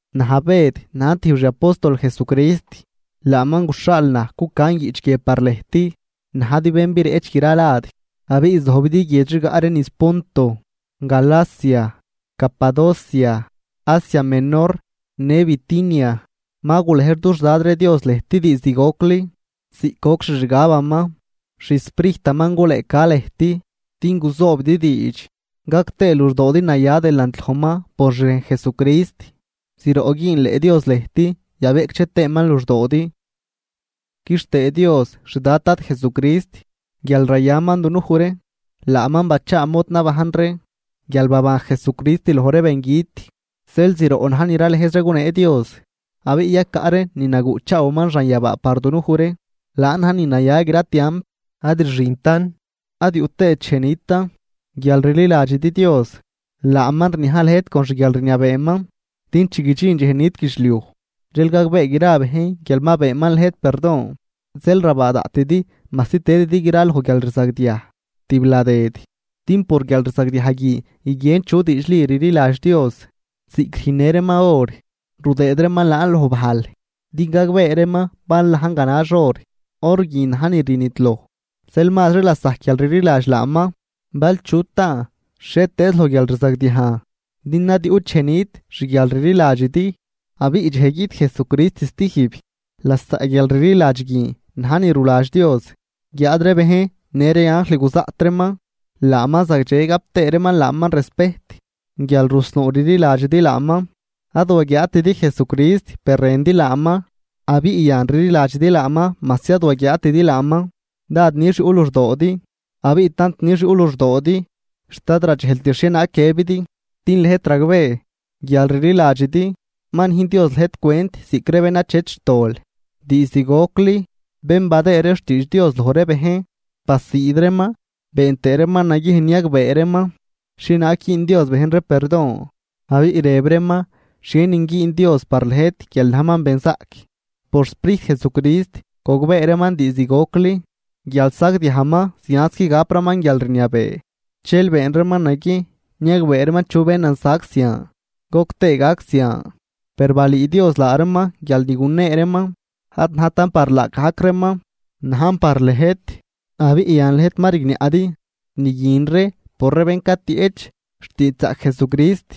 Naj Bëd, najn tijb xi apóstol Jesucrist, laaman guxhaal naj, cucan guiꞌch guie par lëjt najdi bén bireꞌch gra lad abiꞌ zojbidi guiedx rigaꞌ ree niz Ponto, Galacia, Capadocia, Asia Menor në Bitinia. Ma gulej dux Dad ree Dios lëjt diizd gocli, ziꞌc goc xixgabaman. xSprijtaman gulëëca lëjt din guzoobidi diidx gac tëë luxdoodi naya delant lojman por xrejn Jesucrist. Zroꞌ güünleꞌ Dios lëjt yabeꞌcdxe tëëman luxdoodi. Quixtëë Dios xdad Dad Jesucrist, guial rayaman dunuj ree. Laaman bachaa mod nabajn ree guial baban Jesucrist loj ree bengüt, zeel zroꞌ na̱j ni ralëjz ree gunee Dios. Abiꞌ yacaꞌ ree ni naguꞌchaawaman xanyabaa par dunuj ree, laan na̱j ni naya gra tiamp, ad rxintan, ad yuꞌ tëët dxej nitan. Guial rliladxidi Dios, laaman rniaj lëjt con xguialrniabeeman, din chi guidxin dxej nit guidxliuj, dxel gagbee gra bejn guial ma beenman lëjt perdon. Zeel rabaa daꞌtidi majsi tëdidi graloj guialrzagdiaj tibladëd, din por guialrzagdiaj guin guiguien chu diidxli rliladx Dios, ziꞌc rüjnnë reeman or, rudëëd reeman laan loj bajl din gagbee reeman bal najn ganax or. Or guin najn ni rnidloj, zeel mazri lasajc guialrliladx laaman, bal chu taan xhietëëz loj guialrzagdiajn, din ad yuꞌt dxej nit xguialrliladxidi. Abiꞌ dxej guiꞌt Jesucrist stijb, lasaꞌ guialrliladx guin na̱j ni ruladx Dios, guiáad ree bejn në ree anjl guzaꞌt reeman laaman zagdxe gap tëë reeman laaman respejt guial rusnuu rliladxidi laaman. Ad waguiaatidi Jesucrist per rëndi laaman, abiꞌ yan rliladxidi laaman majsi ad waguiaatidi laaman, dád nix yuꞌ luxdoodi abiꞌ tant nix yuꞌ luxdoodi, xt ad radxejlt xhienaag guiëbidi, din lëjt ragbee, guial rliladxidi, ma nüjn Dios lëjt cwent ziꞌc ree bén achet xtol. Diizd gocli, bén badëë ree xtiidx Dios loj ree bejn basiid reeman been tëë reeman naguiejn niagbee reeman xhienaag güün Dios bejn ree perdon, abiꞌ rëb reeman xhienin güün Dios par lëjt guial najman benzaꞌc. Por xSprijt Jesucrist gogbee reeman diizd gocli guial sagdiajman zianz qui gapraman guialrniabee, dxel been reeman naguiejn niagbee reeman chu benan sac zian goc tëë gac zian. Per balüü Dios laa reeman guial ni gunee reeman ad najtan par laagajc reeman, najn par lëjt, abiꞌ yan lëjt ma rigniaꞌdi ni guin ree por ree bén catieꞌch xtiidxzaꞌc Jesucrist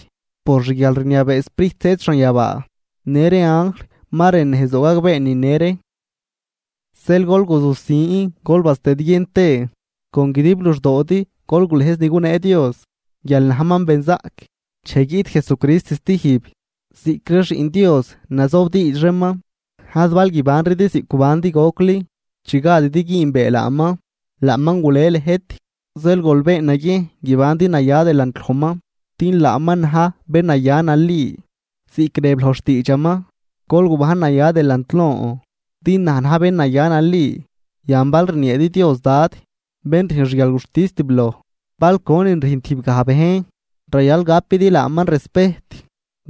por xguialrniabee Sprijt zëëd xanyabaa. Në ree anjl ma rën nejzdoo gagbee nine ree. Zeel gol guzusin gol bastëdguien tëë, con guidib luxdoodi gol gulëjz ni gunee Dios guial najman benzaꞌc, dxej guiꞌt Jesucrist stijb. Ziꞌc ree xiꞌn Dios nazobdiidx reeman, ad bal guibanridi ziꞌc gubandi gocli chi gadidi güünbee laaman. Laaman gule lëjt, zeel gol been naguiejn guibandi naya delant lojman, din laaman na̱j bén naya nali. Ziꞌc rëb loj xtiidxaman: “Gol gubajn naya delant lon, din naj na̱j bén naya nali.” Yan bal rnieedi Dios “Dad”, bén rüjn xguialguxtis tibloj, bal conin rüjn tijb gaj bejn, rayal gapidi laaman respejt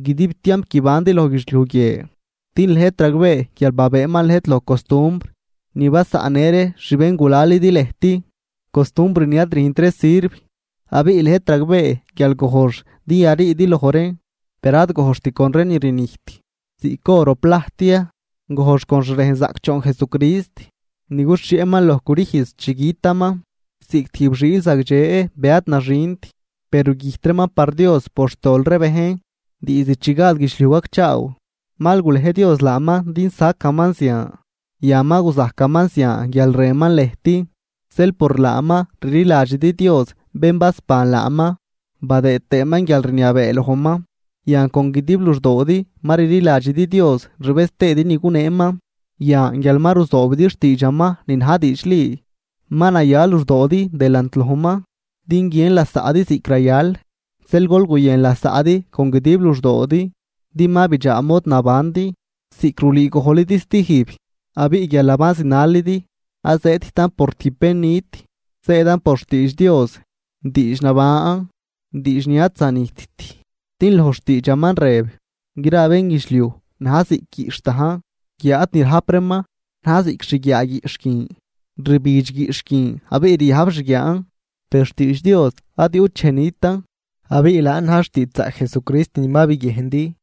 guidib tiamp guibandi loj guidxliuj guie. Din lëjt ragbee guial babëëman lëjt loj costumbr ni basaꞌnnë ree xbéngulalidi lëjt, costumbr ni ad rüjnt ree sirv, abiꞌ lëjt ragbee guial gojx din yariidi loj reen, per ad gojxt con ree ni rnijt, ziꞌc or o plajt ya, gojx con xrejn zaꞌcdxoon Jesucrist ni guxhieꞌman loj crüjz chi gütaman ziꞌc tijb xiil zagdxe be ad naxint, be rugüjt reeman par Dios por xtol ree bejn. Diizd chi gad guidxliuj gacchaaw, mal gulej Dios laaman din sacaman zian, yan ma guzajcaman zian guial rënman lëjt. Zeel por laaman rliladxidi Dios bén basban laaman badëë tëëman guialrniabee lojman, yan con guidib luxdoodi ma rliladxidi Dios rbëz tëëdi ni guneeman. Yan, guial ma ruzoobidi xtiidxaman ni na̱j diidxli, ma naya luxdoodi delant lojman din guiën lasaꞌdi ziꞌc rayal, zeel gol guyën lasaꞌdi con guidib luxdoodi. Din ma bidxaa mod nabandi, ziꞌc rulüü gojlidi stijb, abiꞌ guialnaban zinalidi ad zëëdtan por tijb bén nit, zëëdan por xtiidx Dios, diidx naban, diidx ni ad zanijtt, din loj xtiidxaman rëb: Gra bénguidxliuj na̱j ziꞌc guiꞌxh dajn, guiáad ni rajp reeman na̱j ziꞌc xguiaa guiꞌxh guin. Rbidx guiꞌxh guin, abiꞌ riajb xguiaan, per xtiidx Dios ad yuꞌt dxej nitan. Abiꞌ laan na̱j xtiidxzaꞌc Jesucrist ni ma biguiejndi.